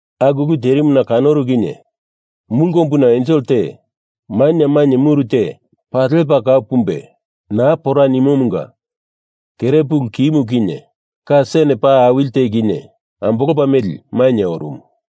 Aku ulu terimuna kanoru kinye mulu kombuna ensel te, maina mainye muru te paa lepa kau pumbe naa pora nimomunga kere pulu kimu kinye ka sen paa awili te kinye ambolopa meli, mainye orumu.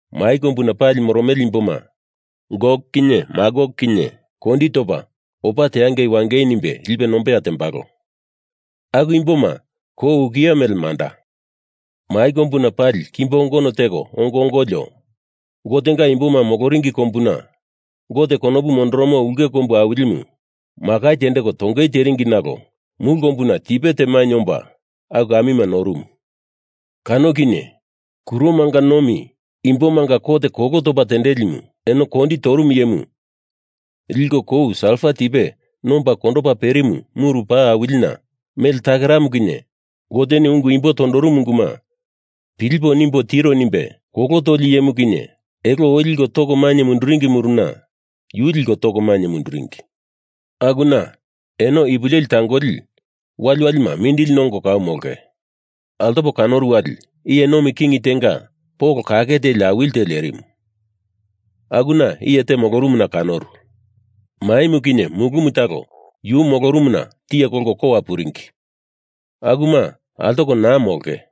mai kombuna pali moromele imboma, Gok kinye Magok kinye kondi topa opa teangei wangei nimbe lipe nombeya tembalo. Aku imboma kou ukiye mele manda. Mai kombuna pali kimbo kongono teko ongo ongolio, Gotenga imboma moloringi kombumu, Gote konopu mondoromo ulke kombu awilimu, makai tendeko tongei teringi nalo mulu kombuna tipe te mainye omba aku amima norumu. Kano kinye kuromanga nomi imbomanga kot kolo topa tendelimu, eno kondi torumu iyemu, liko kou salfa tipe nomba kondopa perimu muru paa awilina, mele takeramu kinye Goteni ungu imbo tondorumu unguma pilipo nimbo tiro. nimbe kolo toli iyemu kinye elo oi liko toko mainye munduringi muruna, yu liko toko mainye munduringi. Akuna eno ipu leli tangoli waliwalima mindili nongo kau molonge. Altopo kanoru wali iye nomi king tenga polo kake teli awili te lerimu, akuna iye te molorumuna kanoru. Maimu kinye mulumu talo yu molorumuna tiye kolko kowa puringi. Akuma altoko naa molonge.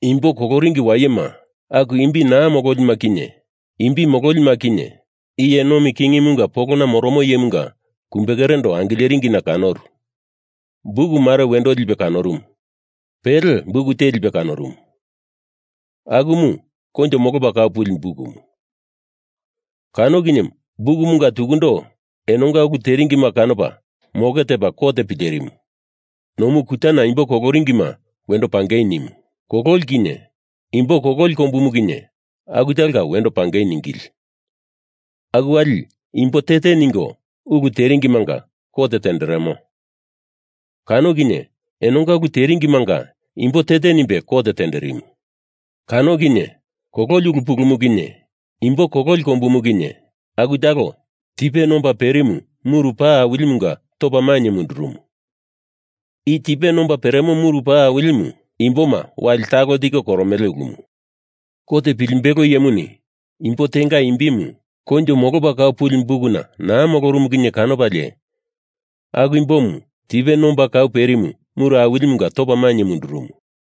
Imbo koloringi wayema, aku imbi naa mololima kinye imbi mololima kinye, iye nomi kingimunga polona moromo Iyemunga kumbekerendo angileringina kanoru. Buk mare wendo lipe kanorumu. Pele buk te lipe kanorumu, akumu koinjo molopa kau puli bukumu. Kano kinye bukumanga tukundo enonga ulu teringima kanopa moke tepa kot pilerimu. Nomu kutana imbo koloringima wendo pangei nimu. Kololi kinye Imbo Kololi Kombumu kinye aku talonga wendo pangei ningili. Aku wali imbo te te ningo ulu teringimanga kot tenderemo. Kano kinye enonga ulu teringimanga imbo te te nimbe kot tenderimu. Kano kinye kololi ulu pulumu kinye imbo kololi kombumu kinye aku talo tipe nomba perimu muru paa awilimunga topa mainye mundurumu. I tipe nomba peremo muru paa awilimu imboma wali talo tiko koromele ulumu. Kot pilimbelo iyemuni imbo tenga imbimu koinjo molopa kau puli bukuna naa molorumu kinye kanopalie aku imbomu tipe nomba kau perimu muru awilimunga topa mainye mundurumu.